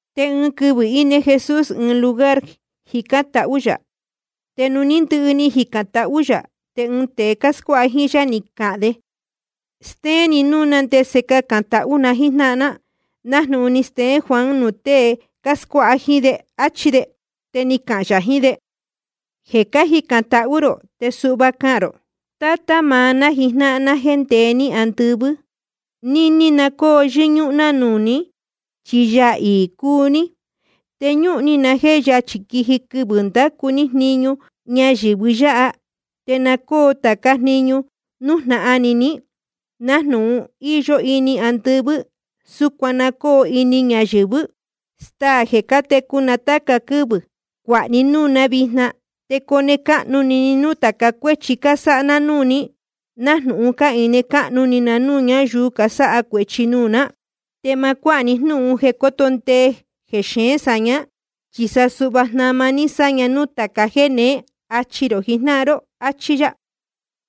Te ɨɨn quɨvɨ̄ íne Jesús ɨɨn lugar jicán tahú yā. Te nuū ní ndɨhɨ ni jicān tahú yā, te ɨɨn tēe scuáha jíín yá, ni cahān de: Stéén ni núū ná ndese cacān tahú na jíjnáhan ná, nájnūhun ni steén Juan nuū tée ni cascuáha jíín de, áchí de. Te ni cahān yā jiín de: Jeē cacán tahú rō, te suhva cahān rō: Tátá maá ná jijnáhan ná jéē ndeé ní andɨvɨ́, níní na cóo yɨ́ñúhún ná nuū ní, chi Yaā iī cúu ní. Te ñúhun ni na jéē yachī quiji quɨvɨ̄ ndacu ní jniñu nɨ́ɨ́ ñáyɨ̄vɨ yáha. Te na cóo tācá jniñu nújnahan ni ní, nájnūhun íyó ini andɨvɨ́, súcuan na cóo ini ñayɨ̄vɨ́. Staā jeē cátecu na táca quɨ́vɨ̄, cuāha ní núū ná vijna. Te cone cáhnu ni ni núū tāca cuéchi cásáha ná núū ní, nájnūhun cáhine cáhnu ni na núū ñáyuu casáha cuēchi nuū ná. Te ma cuáha ní jnúhun jeē coto ndee jexeén sāñá, chi sa suhva jnama ní sáña nuū tāca jéē neé. Achi rō jijnáhan ró. Achí yá.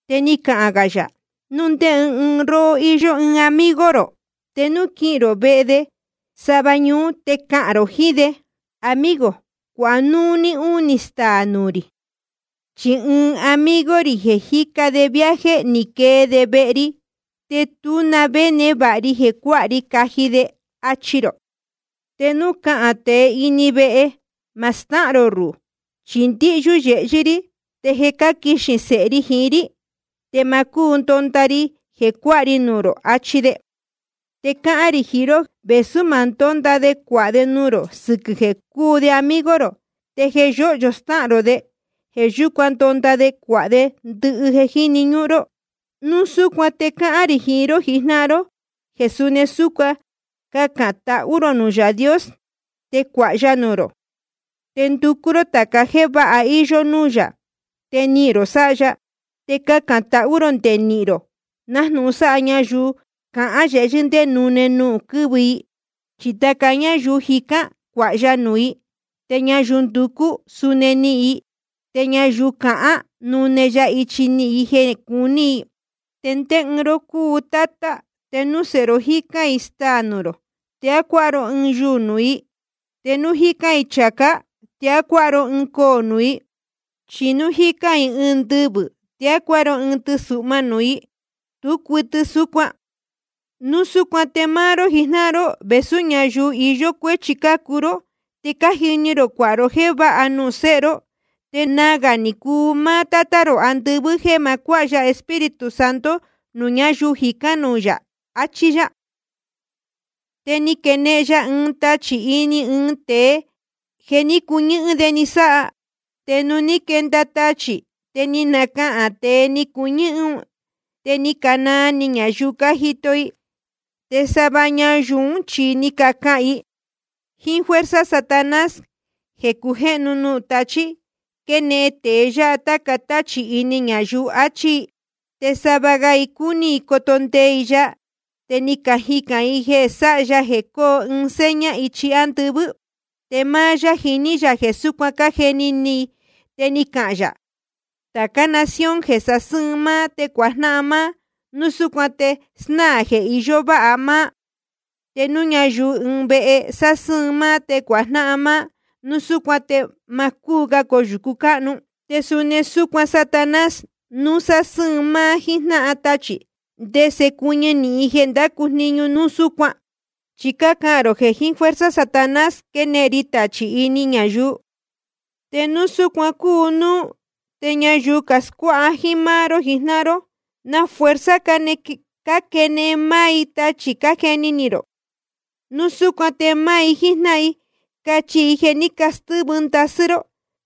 Te ni cahān gā yā: Núu ndé ɨɨn róhó íyó ɨɨn amigo rō, te núu quihīn rō vehe de sava ñuú te cahān rō jiín de: Amigo, cuāha núu unī staā nuū rī. Chi ɨɨn amigo rī jeē jíca de viaje, ni quee de vehe ri, te tú na vé névāha ri jeē cuáha ri caji de. Achi rō. Te núu cahān tēe íne ini vehe: Ma stáhān rō ruhū, chi ndíhyú yehyɨ́ rí, te je cáquixī sēhe ri jiín rí, te ma cúu ndonda ri jeē cuáha ri nuū rō, achi de. Te cáhán rī jiín ró, vēsú ma ndónda de cuāha de nuū rō sɨquɨ̄ jeē cúu de amigo rō, te jeē yóhyo stáhān rō de, jeē yúcuan ndonda de cuāha de ndɨhɨ jeē jíni ñúhún ró. Núu súcuan te cáhán rī jiín ró jijnáhan ró jeē suni súcuan cacān tahú rō nuū Yaā Dios, te cuāha ya nuū rō. Te nducú ró tāca jéē váha íyó núū yā, te nihīn rō sáha ya. Te cacān tahú rō nde nihīn rō, nájnūhun sáha ñayuu cahán yehyɨ́ ndé nune quɨ̄vɨ i. Chi tāca ñáyuu jicán, cuāha ya nuū i. Te ñayuu nducú, suni nihīn i. Te ñayuu cahán, nune ya ichi nihīn i jeē cuní i. ’¿Te ndé ɨɨn ró cúu tátá, te núu sēhe ró jícán i staā nuū rō, te á cuáha ró ɨɨn yuū nuū i? Te núu jícán i chācá, ¿te á cuáha ró ɨɨn coō nuū i? Chí núu jícán i ɨɨn ndɨvɨ̄, ¿te á cuáha ró ɨɨn tɨsuhma nuū i? Tú cuɨtɨ súcuan. Núu súcuan te máá ró jijnáhan ró, vēsú ñáyuu iyó cuéchi cácuu ró, te cájini rō cuāha ró jéē váha nuū séhe ró. Te nagā ni cuu máá Tátá rō andɨvɨ́ jéē ma cuáha ya Espíritu Santo nuū ñáyuu jicán nuū yā. Achí yá. Te quénehen ya ɨɨn tachī ini ɨɨn tēe, jeē ní cuñɨ́hɨ́n de ni sáha. Te nuū ní quenda tachī, te ni nacahān tēe ni cuñɨ́hɨ́n un. Te ni canaa ni ñayuu cájito i. Te sava ñayuu ún chi ni cacahān i: Jíín fuerza Satanás jeē cujéhnu nuū tachí, quénehen tēe yáha táca táchī ini ñayuu, achí i. Te sava ga i cúní i coto ndee i ya, te ni cajicān i jeē sáha ya jeē coo ɨɨn seña ichi ándɨvɨ́. Te máá yá jiní yā jeē súcuan cájeni ni i, te ni cahān yā: Tācá nación jeē sasɨ́ɨn máá te cuajnáhan máá, núu súcuan te snáā jeē iyó váha máá. Te núu ñayuu ɨɨn vehe sásɨ́ɨn máá te cuajnáhan máá, núu súcuan te ma cúu ga coyūcu cáhnu. Te suni súcuan Satanás, núu sásɨ́ɨn máá jíín jnáhan tachī, ¿te ndese cuɨñɨ nīhin jeē ndácu jniñu núu súcuan? Chi cácahān rō jeē jiín fuerza Satanás quénehen ri tachī ini ñayuu. Te núu súcuan cúu núú, te ñayuu cascuáha jíín máá ró jijnáhan ró, ¿na jiín fuerza cáquenehen máá i tachī, cájeni ni rō? Núu súcuan te máá i jíjnáhan i cachi jeē ní castɨ́vɨ ndasɨ́ ró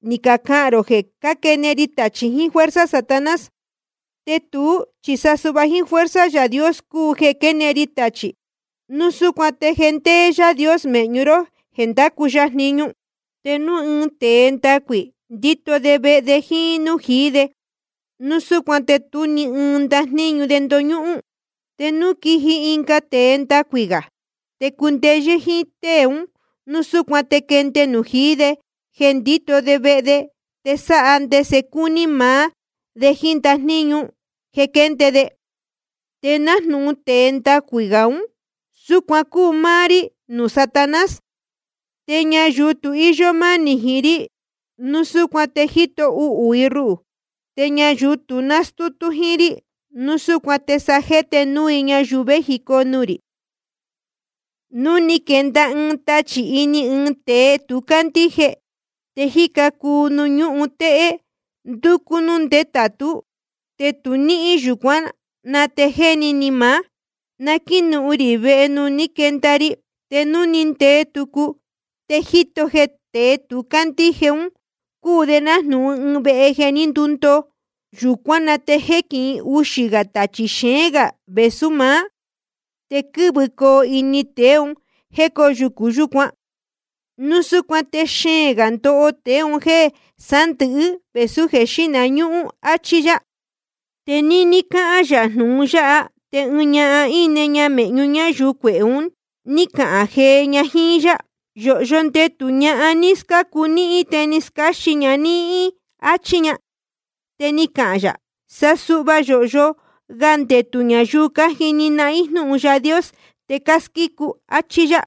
ni cacahān rō jeē cáquenehen ri tachī jiín fuerza Satanás. Te tuú chi sa suhva jíín fuerza Yaā Dios cúu jeē quénehen ri tachī. Núu súcuan te je ndéé Yaā Dios mēhñu ró jéē ndácu ya jniñu. ’Te núu ɨɨn tēe ndacuī, ndíto de vehe de jíín nújīí de, núu súcuan te tú ni ɨɨn ndajníñu de ndoñúhún. Te núu quiji ɨnga tēe ndacuī gā, te cundeyɨ́ jíín tée ún, núu súcuan te quende nujīí de jeē ndíto de vehe de, te sáha de ndese cúní maá de jíín ndajníñu jeē quénde de. Te nájnūhun tēe ndacuī gā ún, súcuan cúu máá rí nuū Satanás. ’Te ñayuu tu íyó mánī jiín rí, núu súcuan te jíto uhū i ruhū. Te ñayuu tu nástútú jíín rí, núu súcuan te sa jéte núu i ñayuu vējicoo nuū rī. ’Núu ni quenda ɨɨn tachī ini ɨɨn tēe tu cándíje, te jíca cuu nuū ñúhun téhé, ndúcú núū ndétātú, te tu níhín, yūcuán na te jéni ni maá: Na quínuhun rī vehe nuū ní quenda ri. Te núu ni ndee tucu, te jíto jeē tēe tu cándíje un cúu de nájnūhun ɨɨn vehe jeē ní ndundoo. Yūcuán na te jéquihin uxā gā tachī xeén gā vēsú maá. Te quɨ́vɨcoo ini tēe un jéē cóyūcu yúcuan. Núu súcuan te xeēn gā ndoho tēe un jéē sándɨ̄hɨ́ vēsú jeē xíhna ñúhún. Achí yá. Te níní cáhán yā jnūhun yáha, te ɨɨn ñahan íne mēhñu ñáyuu cuehē un, ní cahān jee ña jíín yá: Yōhyo ndetū ñahan ní scácu níhín te ni scáxin ña níhín, áchí ña. Te ni cahān yā: Sa suhva yōhyo ga ndetū ñayuu cájini nahín jnúhun Yaā Dios te cásquícu i, áchí yá.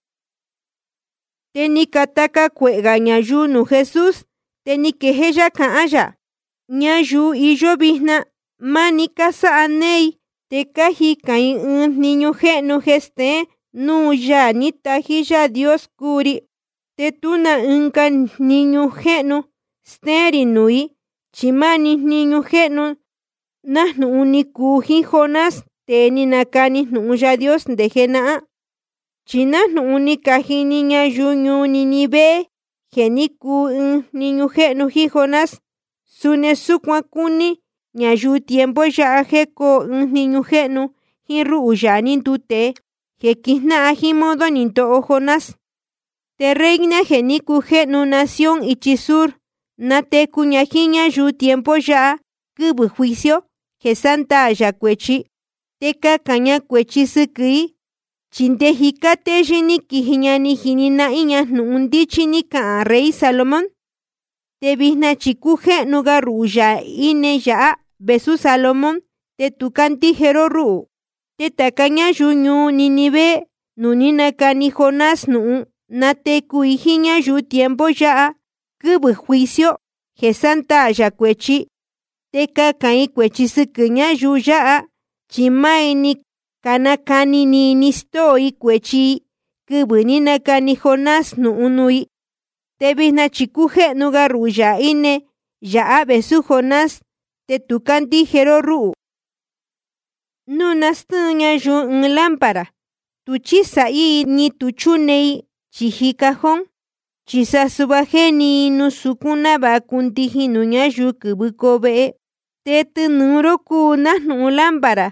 Te ni cataca cuehē gā ñayuu nuū Jesús, te ni quejéé yá cahán yā: Ñayuu iyó vijna máni cásáha néé i. Te cájicān i ɨɨn jniñu jéhnu jeē steén núu Yaā ní tají Yaā Dios cúu ri. Te tú na ɨnga jniñu jéhnu stéén rī nuū i, chi máá‑ni jniñu jéhnu nájnūhun ni cuu jíín Jonás, tēe ni nacani jnūhun Yaā Dios nde jenahán. Chi nájnūhun ni cajini ñayuu ñuu Nínive jeē ní cuu ɨɨn jniñu jéhnu jíín Jonás, suni súcuan cuni ñayuu tiempo yáha jeē coo ɨɨn jniñu jéhnu jíín rúhū, Yaā ní nduu tēe, jeē quijnáhan jíín modo ni ndoho Jonás. Te reina jeē ní cujéhnu nación ichi sur, natecu ña jíín ñáyuu tiempo yáha, quɨvɨ̄ juicio jeē sándaā yā cuēchi, te cahān ña cuēchi sɨquɨ̄ i. Chi nde jicá téyɨ́ ní quiji ña ni jini nahín ña jnūhun ndíchí ní cahān rey Salomón. Te vijna chi cújéhnu ga ruhū, Yaā íne yāhá vēsú Salomón, te tu cácandíje ró rúhū. Te tāca ñáyuu ñuu Nínive nuū ní nacani Jonás jnūhun, natecu i jíín ñáyuu tiempo yáha, quɨvɨ̄ juicio jeē sándaā yā cuēchi, te cahān i cuēchi sɨquɨ̄ ñáyuu yáha. Chi máá i ni canacani ni i ni castóo i cuēchi i quɨvɨ̄ ní nacani Jonás jnūhun nuū i. Te vijna chi cújéhnu ga ruhū, Yaā íne yāhá vēsú Jonás, te tu cácandíje ró rúhū. ’Núu nástɨ́ɨn ñayuu ɨɨn lámpara, tu chísāhí i, ni tu chúne i chīji ɨɨn cajón. Chi sa suhva jéni i nuū sucún, návāha cundijin nuū ñáyuu quɨ́vɨcoo vehe. Te tɨnūu ró cúu nájnūhun lámpara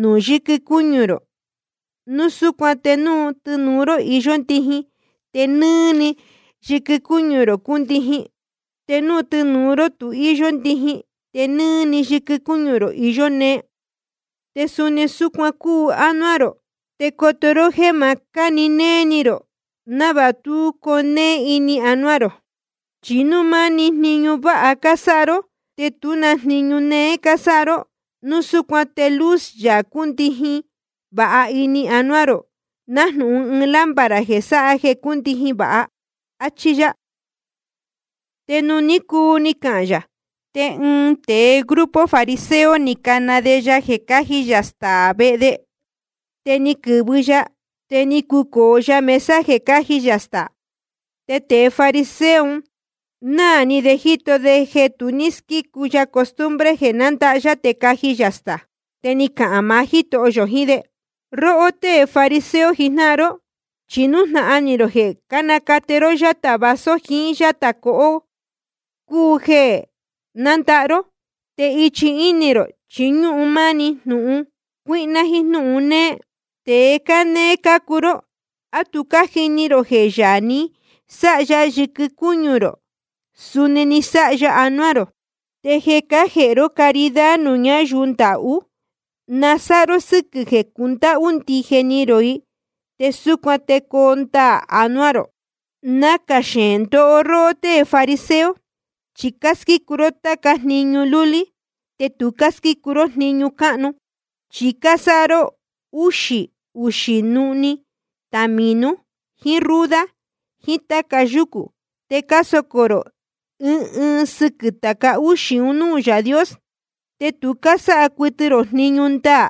nuū yɨquɨ cúñu rō. Núu súcuan te núu tɨnūu ró íyó ndijin, te nɨ́ɨ́‑ni yɨquɨ cúñu rō cúndijin. Te núu tɨnūu ró tu íyó ndijin, te nɨ́ɨ́‑ni yɨquɨ cúñu rō iyó nee. Te suni súcuan cúu ánuá rō, te coto ró jéē ma cáni néé ni rō, návāha tú coo nee ini anuá rō. Chi núu máni jniñu váha cásáha ró, te tú na jniñu néé cásáha ró, núu súcuan te luz yā cúndijin vāha ini anuá rō, nájnūhun ɨɨn lámpara jeē sáha jeē cúndijin vāha. Achí yá. Te nuū ní cuu ni cahān yā, te ɨɨn tēe grupo fariseo ni cana de ya jeē caji yā staā vehe de. Te ni quɨ̄vɨ ya, te ni cucōo ya mesa jeē cáji yā staā. Te tēe fariseo un náā ni de jíto de jeē tu squícu ya costumbre jeē nandahá yá te caji yā staā. Te ni cahān maá Jítoho yō jiín de: Róhó tée fariseo jijnáhan ró, chi nájnūhun jeē cánacate ró yátā vaso jiín yátā cohó cúu jeē nándahá ró. Te ichi íni rō chi ñúhun máni máá jnúhun cuíhná jíín jnúhun néé. Tēe cánéé cácuu ró. ¿A tu cájini rō jeē Yaā ni sáha yɨquɨ cúñu rō, suni ni sáha ya anuá rō? Te jeē cájēhe ró caridad nuū ñáyuu ndahú, na sáha ró sɨ́quɨ̄ jeē cundáhú ndije ni rō i. Te súcuan te coo ndaā anuá rō. ’Nacā xeēn ndoho róhó tée fariseo, chi cásquícu ró tācá jniñu lúlí, te tu cásquícu ró jniñu cánuú. Chi cásáha ró úxī uxī nuhnī tamīnu jíín ruda jiín táca yucū, te cásocō rō ɨɨn ɨɨn sɨquɨ̄ tāca úxī un núū Yaā Dios. Te tu cásáha cuɨtɨ rō jniñu ndaā,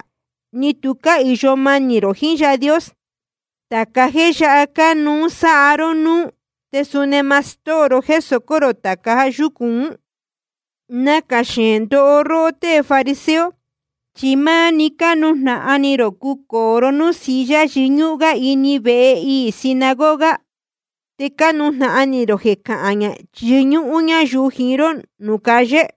ni tu cáhīyo manī rō jiín Yaā Dios. Tāca jéē yáha cánuú sáha ró núú, te suni ma stóo ró jéē socó rō tāca yúcū ún. ’Nacā xeēn ndoho róhó tée fariseo, chi máni cánujnahan ni rō cucōo ró núū silla yɨñúhún gá ini vehe iī sinagoga. Te cánujnahan ni rō jeē cahán yɨñúhún ñáyuu jiín ró nuū calle.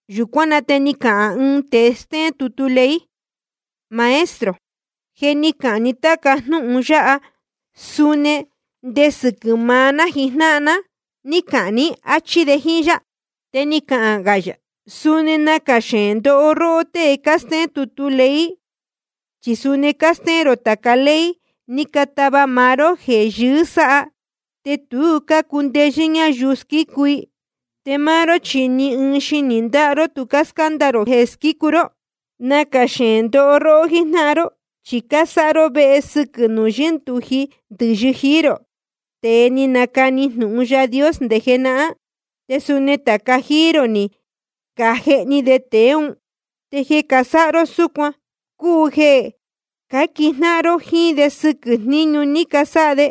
Yūcuán na te ni cahān ɨɨn tēe stéén tutu ley: Maestro, jeē ni cáhān ni táca jnúhun yáha, suni nde sɨquɨ̄ maá ná jíjnáhan ná ní cahān ní, áchí de jíín yá. Te ni cahān yā: Suni nacā xeēn ndoho róhó tée cástéén tutu ley. Chi suni cástéén rō tāca ley ni catava maá ró jeē yɨɨ́ sáha, te tu cácundeyɨ́ ñáyuu squícu i. Te máá ró, chi ni ɨɨn xinī ndáha ró tu cáscánda ró jéē squícu ró. ’Nacā xeēn ndoho ró jíjnáhan ró. Chi cásáha ró vehe sɨquɨ̄ nuū yɨ́ndūji ndɨ̄yɨ jií rō, tēe ni canacani jnūhun Yaā Dios nde jenahán. Te suni tāca jíí rō ni cajehni de tēe ún. Te jeē casáha ró súcuan cúu jeē cáquijnáhan ró jíín de sɨquɨ̄ jníñu ní casáha de.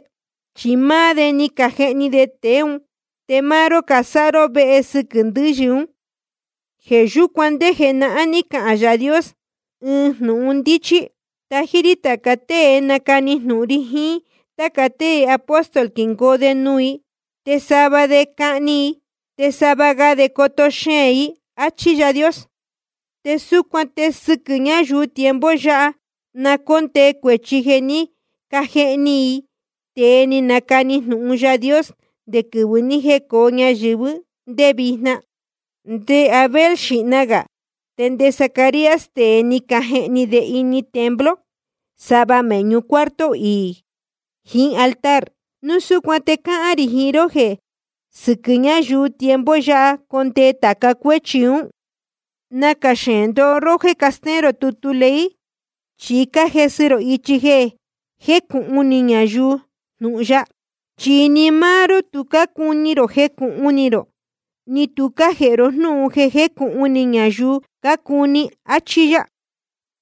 Chi máá de ni cajehni tēe ún, te máá ró cásáha ró vehe ndɨ̄yɨ ún. ’Jeē yúcuan nde jenahán ní cahān Yaā Dios ɨɨn jnūhun ndíchí: Tají rí tāca tée nacani jnūhun ri jiín táca tée apóstol quingoo de nuū i. Te sava de cahni i, te sava ga de coto xeēn i, áchí Yaā Dios. Te súcuan te sɨquɨ̄ ñáyuu tiempo yáha na cóndee cuēchi jeē ní cajehni jií i tēe ni canacani jnūhun Yaā Dios, nde quɨvɨ̄ ni jécōo ñayɨ̄vɨ́ te nde vijna, nde Abel xīhna gā te nde Zacarías, tēe ni cajehni de ini templo sava mēhñu cuarto iī jiín altar. Núu súcuan te cáhán rī jiín ró jeē sɨquɨ̄ ñáyuu tiempo yáha condee tāca cuéchi ún. ’Nacā xeēn ndoho róhó jéē castéén tutu ley, chi cájesɨ rō ichi jeē jécūhun ni ñayuu jnūhun ya. Chi ni máá ró tu cácuni rō jecūhun ni rō, ni tu cájēhe ró jnúhun jeē jecūhun ni ñayuu cácuni. Achí yá.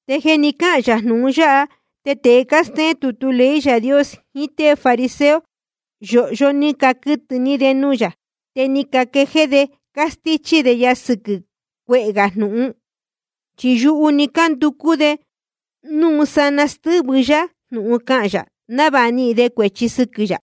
Te jeē ni cáhān yā jnūhun yáha, te tēe cástéén tutu ley Yaā Dios jiín tée fariseo, yōhyo ni caquɨtɨ̄ ni de nuū yā. Te ni caquejéé de cástíchí de ya sɨquɨ̄ cuehē gā jnūhun. Chi yuhu‑ni cánducú de núu sanaa te stɨ́vɨ yá jnūhun cahān yā, návāha nihīn de cuēchi sɨquɨ̄ yā.